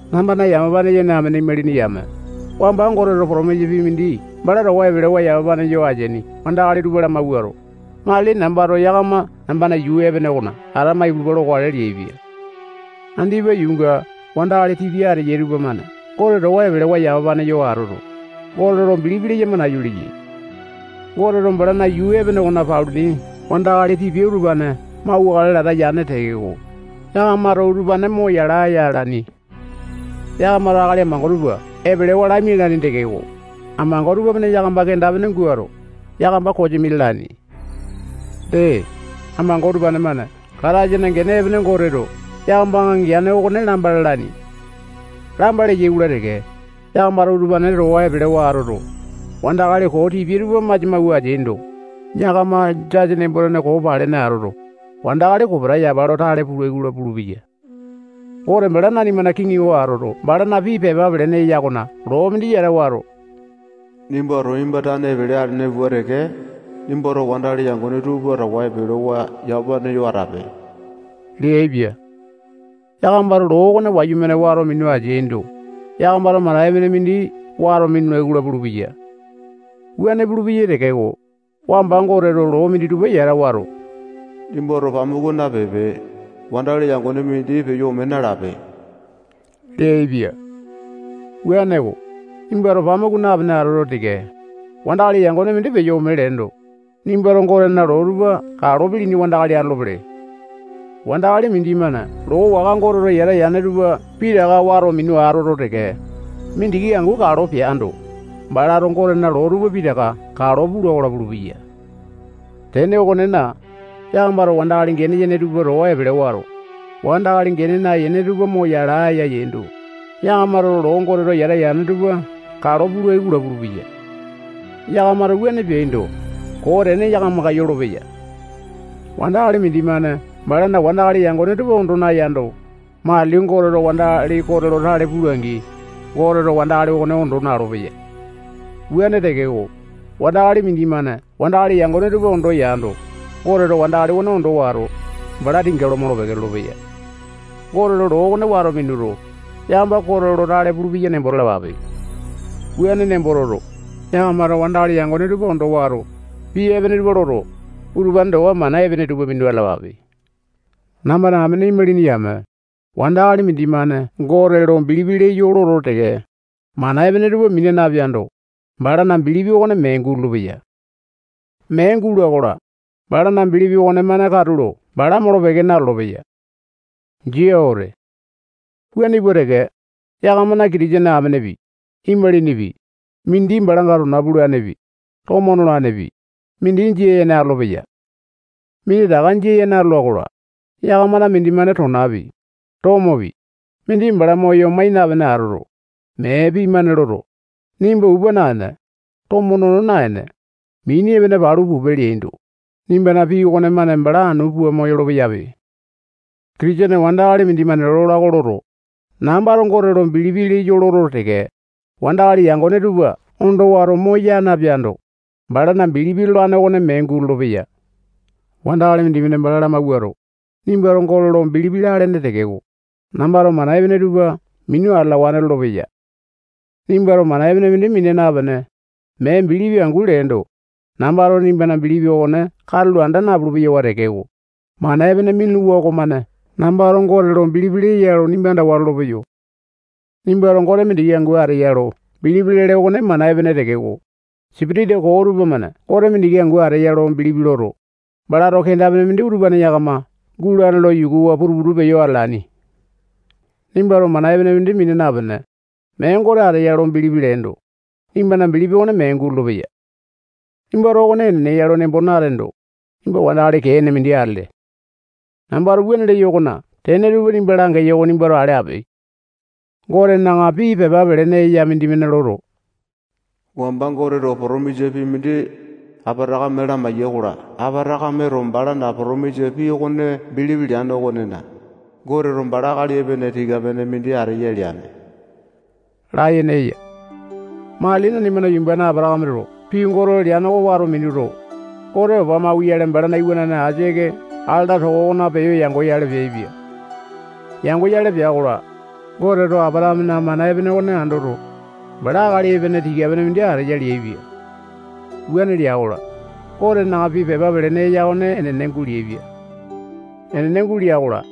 Nambana yamapane yene amene imalini yame, wamba Goteto potomisa pii mindi bala towa epelewa yamapane yo ateaini wandakali tupa lamawuato, matili nambato yakama nambana yuu epene okona atama ipulupa lokale leaipia. Andipa yuunga wandakali tipia ateyai tupamane Gote towa epelewa yamapane yo atoto, Gote lo bilipi leyama nayu leyai. Goteto balana yuu epene okone paluni wandakali tipia utupane mauwakale lata yane tekeko, yakamato utupane mo yala aya alaini. Yakamato akali amango tupa epelewa lamialaini tekeko, amango tupamane yakama kenda-pene guato, yakama kosimi lalaini. Dee, amango utupane-mane Kataisana gene epene Goteto yakamanga geane okone lamba lalaini. Lamba leyai-kola teke, yakamato utupane towa epelewa atoto, wandakali koo tipia tupa masia mawua ateaindo, yakama jasa nembo-tene koo palene atoto, wandakali kopeta yapa lo tale pulai-kola pulupeyai. Gote bala nanimana kiŋi oko atoto, balana pii pepa pelene eya okona loo mindi yata wato, nimbato nimba tane epele alene pua teke, nimbana wandakali yangone tupa towa epelewa yamapane yo atape leaipia. Yakamato loo okone wayumane wato minu ateaindo, yakamato mana epene mindi wato minulai-kola pulupeya. Wuane pulupeya tekeko, wamba Goteto loo minditupa yata wato, nimbato pamuku napipe, wandakali yangone mindi peyo ome nalape leaipia. Wuaneko, nimbato pamuku napene atoto teke, wandakali yangone mindi peyo ome leendo, nimbato Gotena loo tupa kalo pilini wandakali atolopele. Wandakali mindimane loo waka Goteto yata yane tupa pitaka wato minu atoto teke, mindiki angu kalo peando, balato Gotena loo tupa pitaka kalo pula-kola pulupeya. Tene okonena, yakamato wandakali gene yene tupa towa epele wato, wandakali gene nayene tupa mo yala aya yaindo, yakamato loo Goteto yata yane tupa kalo pulai-kola pulupeya. Yakamato wuane peaindo, koo tene yakamanga yolopeya. Wandakali mindimane balana wandakali yangone tupa ondo nayando, matili Goteto wandakali kote lo tale pula-angi, Goteto wandakali okone ondo na-olopeya. Wuane tekeko, wandakali mindimane wandakali yangone tupa ondo yando, Goteto wandakali okone ondo wato, bala tinga lo molo-peke lolopeya. Goteto loo okone wato minuto, yakama kote lo tale pulupeya nembo talapape. Wuane nembo toto, yakamato wandakali yangone tupa ondo wato, pii epene tupa loto, utupane towa mana epene tupa minu atalapape. Nambana amene imalini yame, wandakali mindimane Gote lo bilipi leyo loto teke, mana epene tupa mina napeando, balana bilipi okone mee gulolo-peya. Mee guloa-kola, balana bilipi okonemane katulo bala molo-peke nalolo-peya. Jia wete. Wuane pua teke, yakamana Kitisene amenepi, imalinipi, mindi balanga tona pulanepi, tomo nolanepi, mindi jia yene atolopeyai. Minditaka jia yene atola-kola, yakamana mindimane tonapi, tomopi, mindi bala moyo mai napene atoto, mee pii-mane loto, nimba upa naene, tomo nono naene, mini epene palu pupe leendo, nimbana pii okonemane bala anu pua moyolo-peyape. Kitisene wandakali mindimane lola oko loto, nambato Gote lo bilipi leyo loto teke, wandakali yangone tupa ondo wato moya napeando, balana bilipi lolane okone mee gulolo-peya. Wandakali mindimane bala lamawuato, nimbato Gote lo bilipi lalene tekeko, nambato mana epene tupa minu atalawane lolopeya. Nimbato mana epene mindi mina napene, mee bilipi angu leendo, nambato nimbana bilipi okone katulo anda napulu-peyo tekeko, mana epene minuluwa okomane nambato Gote lo bilipi leya lo nimba andawa lolopeyo. Nimbato Gote mindiki angu ateya lo bilipi lele okone mana epene tekeko, sipitisa koo tupamane Gote mindiki angu ateya lo bilipi loto, balato kenda-pene mindi utupane yakama gulane lo yukuwa putu-putu peyo atalaini. Nimbato mana epene mindi mina napene, mee Gote ateya lo bilipi leendo, nimbana bilipi okone mee gulolo-peya. Nimbato okone enene ya lo nembo nateendo, nimba wandakali kee ene mindi atele. Nambato wuane leyo okona tene tupa nimba langeyo oko nimbato ale ape. Gotena pii pepa pelene mindimane loto, wamba Goteto potomisa pii mindi Apatakame lamaiya-kola, Apatakameto balana potomisa pii okone bilipi leane okonena, Goteto bala akali epene tika-pene mindi ateya leane layene eya. Matili nanimana yumbane Apatakameto pii Goteto leane oko wato minuto, Gote opa mauyale balana iwanane Aisake alata toko okona peyo yangoyale peaipia. Yangoyale pea-kola, Goteto Apatakamena mana epene okone andoto, bala akali epene tika-pene mindi ateya leaipia. Wuane lea-kola, Gotena pii pepa pelene eya okone enene guleaipia. Enene gulea-kola,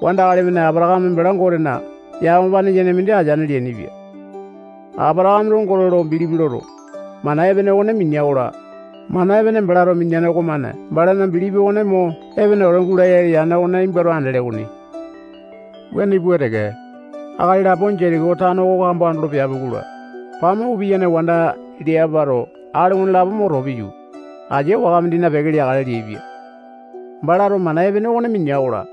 wandakali-mane Apatakame bala Gotena yamapane yene mindi ateane leainipia. Apatakameto Gote lo bilipi loto, mana epene okone minea-kola, mana epene balato mineane okomane balana bilipi okone mo epene wete gulaya yane oko nimbato andele okoni. Wuane pua teke, akali lapo Jetiko tano oko kambo andolo peapi-kola, pamuku piyane wanda Leapato akali okonelapo mo too piyu, asia waka mindina peke leakale leaipia. Balato mana epene okone minea-kola,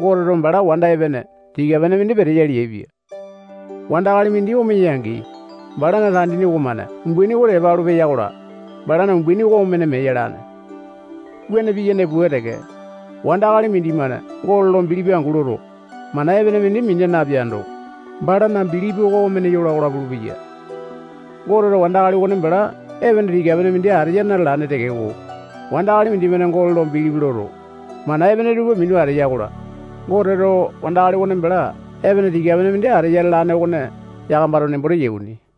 Goteto bala wanda epene tika-pene mindi peteya leaipia. Wandakali mindi omeya-angi, balana tandini okomane umbaini oko tepa alu peya-kola, balana umbaini oko omene mee yalane. Wuane piyane pua teke, wandakali mindimane Gote lo bilipi angu loto, mana epene mindi mina napeando, balana bilipi oko omene yola-kola pulupeya. Goteto wandakali okone bala epene tika-pene mindi ateya na-lalane tekeko, wandakali mindimane Gote lo bilipi loto, mana epene tupa minu ateya-kola, Goteto wandakali okone bala epene tika-pene ateya lalane okone yakamato nembo teyai okoni.